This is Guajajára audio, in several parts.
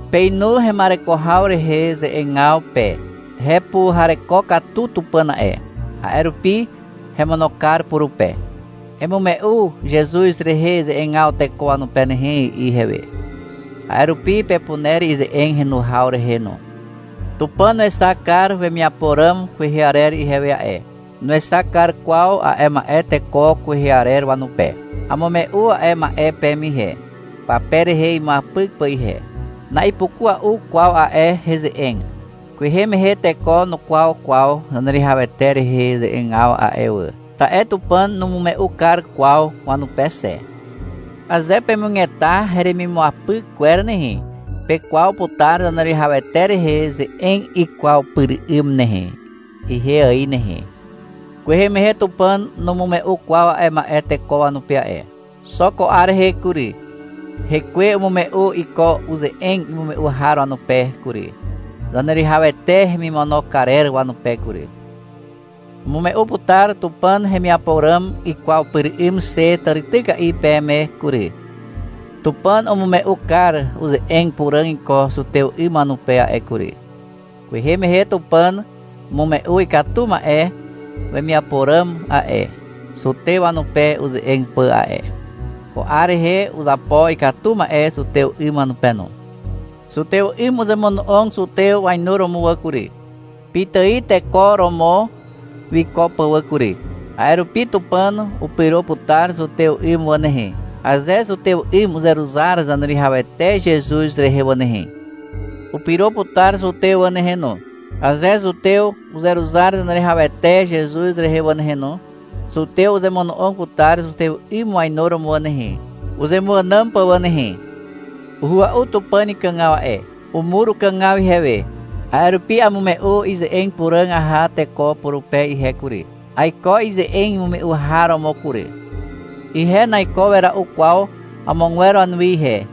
Peinu hema'ereko haw rehe ze'egaw pe. Hepuhareko katu Tupàn a'e. A'e rupi hemono kar purupe. — Emume'u Zezuz rehe ze'egaw teko wanupe nehe, i'i ihewe. A'e rupi pepuner ize'eg henu haw rehe no. Tupàn wexak kar wemiapo ràm kwehe arer ihewe a'e. Nuexak kar kwaw a'e ma'e teko kwehe arer wanupe. Amume'u a'e ma'e peme ihe, pape rehe imuapyk pà ihe. Na'ipukua'u kwaw a'e heze'eg. Kwehe mehe teko nukwaw kwaw Zaneruwihawete rehe ze'egaw a'e wà, ta'e Tupàn numume'u kar kwaw wanupe xe. Aze pemugeta heremimuapyk kwer nehe, pekwaw putar Zaneruwihawete rehe ze'eg ikwaw pyr 'ym nehe, ihe ài nehe. Kwehe mehe Tupàn numume'u kwaw a'e ma'e teko wanupe a'e. Xo ko 'ar rehe kury, Hekwe umume'u iko uze'eg imume'u har wanupe kury, Zaneruwihawete hemimono karer wanupe kury. Amume'u putar Tupàn hemiapo ràm ikwaw pyr 'ym xe tàrityka'i peme kury. Tupàn umume'u kar uze'eg puràg iko zutew 'ym wanupe a'e kury. Kwehe mehe Tupàn umume'u ikatu ma'e wemiapo ràm a'e, zutew wanupe uze'eg pà a'e. Ko 'ar rehe uzapo ikatu ma'e zutew 'ym wanupe no. Zutew 'ym uzemono'og zutew wainuromo wà kury, pitài teko romo wiko pà wà kury. A'e rupi Tupàn upyro putar zutew 'ym wà nehe, aze zutew 'ym uzeruzar Zaneruwihawete Zezuz rehe wà nehe. Upyro putar zutew wà nehe no, aze zutew uzeruzar Zaneruwihawete Zezuz rehe wà nehe no. Zutew uzemono'og putar zutew 'ym wainuromo wà nehe, uzemuànàm pà wà nehe. Uhua'u Tupàn ikàgaw a'e. Umur ukàgaw ihewe, a'e rupi amume'u ize'eg puràg aha teko purupe ihe kury. Aiko ize'eg imume'u har romo kury. Ihe naiko wera'u kwaw amogwer wanuwi ihe,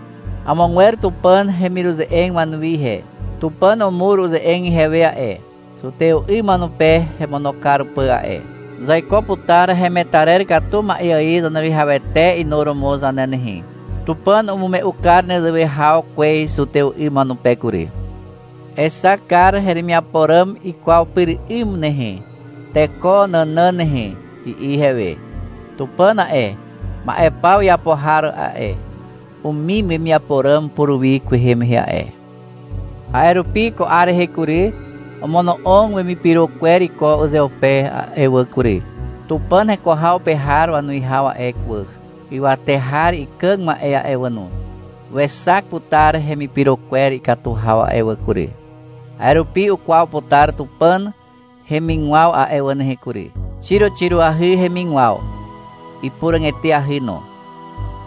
amogwer Tupàn hemiruze'eg wanuwi ihe. Tupàn umur uze'eg ihewe a'e, zutew 'ym wanupe hemono kar pà a'e. Zaiko putar hemetarer katu ma'e ài Zaneruwihawete inuromo zane nehe. Tupàn umume'u kar nezewe haw kwez zutew 'ym wanupe kury. — Exak kar heremiapo ràm ikwaw pyr 'ym nehe, teko nànàn nehe, i'i ihewe. Tupàn a'e, ma'e paw iapo har a'e, umim wemiapo ràm puruwi kwehe mehe a'e. A'e rupi, ko 'ar rehe kury, omono'og wemipyro kwer iko uzeupe a'e wà kury. Tupàn heko haw pe har wanuwihaw a'e wà, ywate har ikàg ma'e a'e wà no, wexak putar hemipyro kwer ikatu haw a'e wà kury. A'e rupi ukwaw putar Tupàn hemigwaw a'e wà nehe kury. Xiroxiroahy hemigwaw. Ipuràg eteahy no.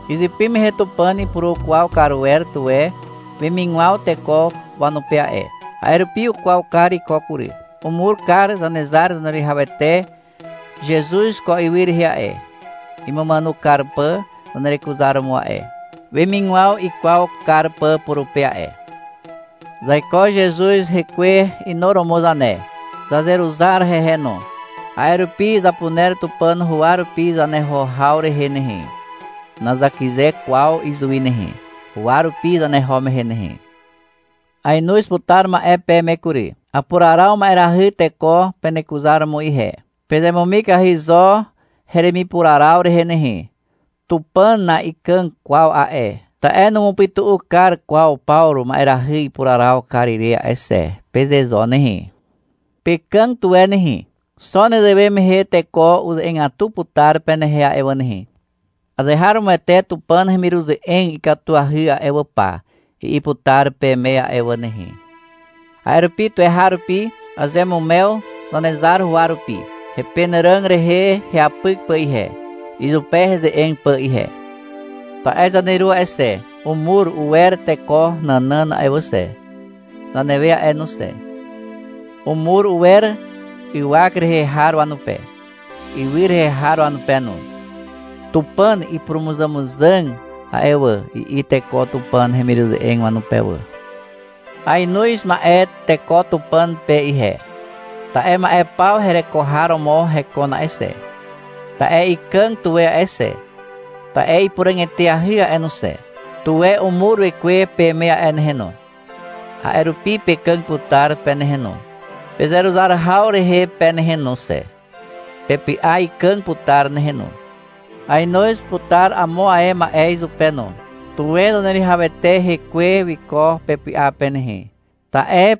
Izypy mehe Tupàn ipurukwaw kar wer tuwe wemigwaw teko wanupe a'e. A'e rupi ukwaw kar iko kury. Umur kar Zanezar Zaneruwihawete Zezuz ko ywy rehe a'e, imumàno kar pà zanerekuzaromo a'e, wemigwaw ikwaw kar pà purupe a'e. Zaiko Zezuz hekwe inuromo zane. Zazeruzar hehe no. A'e rupi zapuner Tupàn huwa rupi zaneho haw rehe nehe. Nazakyze kwaw izuwi nehe, huwa rupi zaneho mehe nehe. Aenoz putar ma'e peme kury. Apuraraw ma'erahy teko penekuzaromo ihe. Pezemumikahy zo heremipuraraw rehe nehe. — Tupàn na'ikàg kwaw a'e, ta'e numupytu'u kar kwaw Pawru ma'erahy ipuraraw ire a'e xe, peze zo nehe. Pekàg tuwe nehe, xo nezewe mehe teko uze'egatu putar penehe a'e wà nehe. — Azeharomoete Tupàn hemiruze'eg ikatuahy a'e wà pa, i'i putar peme a'e wà nehe. A'e rupi tuweharupi azeamumew Zanezar huwa rupi, hepenàràg rehe heapyk pà ihe, izupe heze'eg pà ihe. Ta'e zaneru a'e xe, umur uwer teko nànàn a'e xe, zanewe a'e no xe. Umur uwer ywak rehe har wanupe, ywy rehe har wanupe no. (— Tupàn ipurumuzàmuzàg a'e wà, i'i teko Tupàn hemiruze'eg wanupe wà.) Aenoz ma'e teko Tupàn pe ihe, ta'e ma'e paw hereko har romo hekon a'e xe, ta'e ikàg tuwe a'e xe, ta'e ipuràg eteahy a'e no xe. Tuwe umur Wekwe peme a'e nehe no. A'e rupi pekàg putar pe nehe no, pezeruzar haw rehe pe nehe no xe. Pepy'a ikàg putar nehe no. Aenoz putar amo ae ma'e izupe no. Tuwe Zaneruwihawete hekwe wiko pepy'a pe nehe, ta'e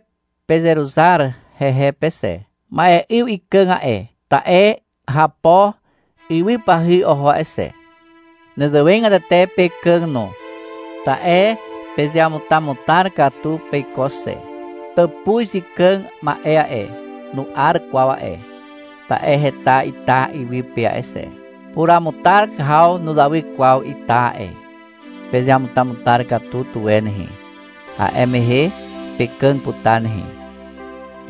pezeruzar hehe pe xe. Ma'e 'yw ikàg a'e, ta'e hapo ywypahy oho a'e xe. Nezewegatete pekàg no, ta'e pezeamutamutar katu peiko xe. Tàpuz ikàg ma'e a'e, nu'ar kwaw a'e, ta'e heta ita iwy pe a'e xe. Puramutar haw nuzawy kwaw ita a'e. Pezeamutamutar katu tuwe nehe. A'e mehe pekàg putar nehe.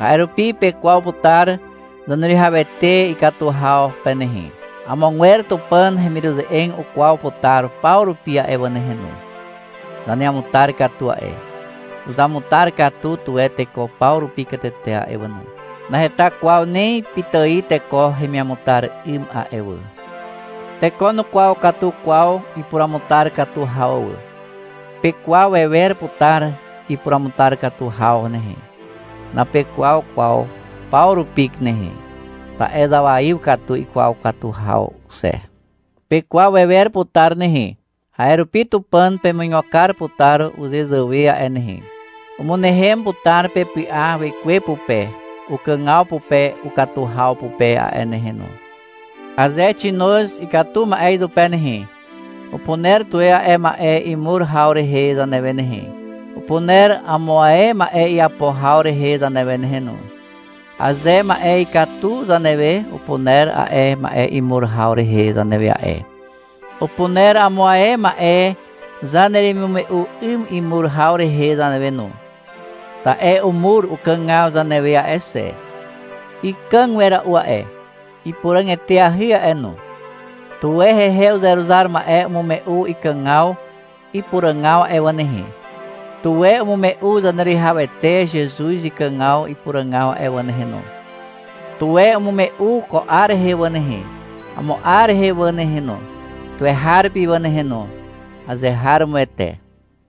A'e rupi pekwaw putar Zaneruwihawete ikatu haw pe nehe. Amogwer Tupàn hemiruze'eg ukwaw putar paw rupi a'e wà nehe no. Zaneamutar katu a'e. Uzamutar katu tuwe teko paw rupi katete a'e wà no. Naheta kwaw ni pitài teko hemiamutar 'ym a'e wà. Teko nukwaw katu kwaw ipuruamutar katu haw wà. Pekwaw wewer putar ipuruamutar katu haw nehe. Napekwaw kwaw paw rupi nehe, ta'e zawaiw katu ikwaw katu haw xe. Pekwaw wewer putar nehe, a'e rupi Tupàn pemuigo kar putar uzezàwe a'e nehe. Umynehem putar pepy'a Wekwe pupe ukàgaw pupe ukatu haw pupe a'e nehe no. Aze xinoz ikatu ma'e izupe nehe, upuner tuwe a'e ma'e imur haw rehe zanewe nehe. Upuner amo ae ma'e iapo haw rehe zanewe nehe no. Aze ma'e ikatu zanewe, upuner a'e ma'e imur haw rehe zanewe a'e. Upuner amo ae ma'e zaneremimume'u 'ym imur haw rehe zanewe no. Ta'e umur ukàgaw zanewe a'e xe. Ikàg wera'u a'e, ipuràg eteahy a'e no. Tuwe hehe uzeruzar ma'e umume'u ikàgaw ipuràgaw a'e wà nehe. Tuwe umume'u Zaneruwihawete Zezuz ikàgaw ipuràgaw a'e wà nehe no. Tuwe umume'u ko 'ar rehe wà nehe, amo 'ar rehe wà nehe no, tuweharupi wà nehe no. Azeharomoete.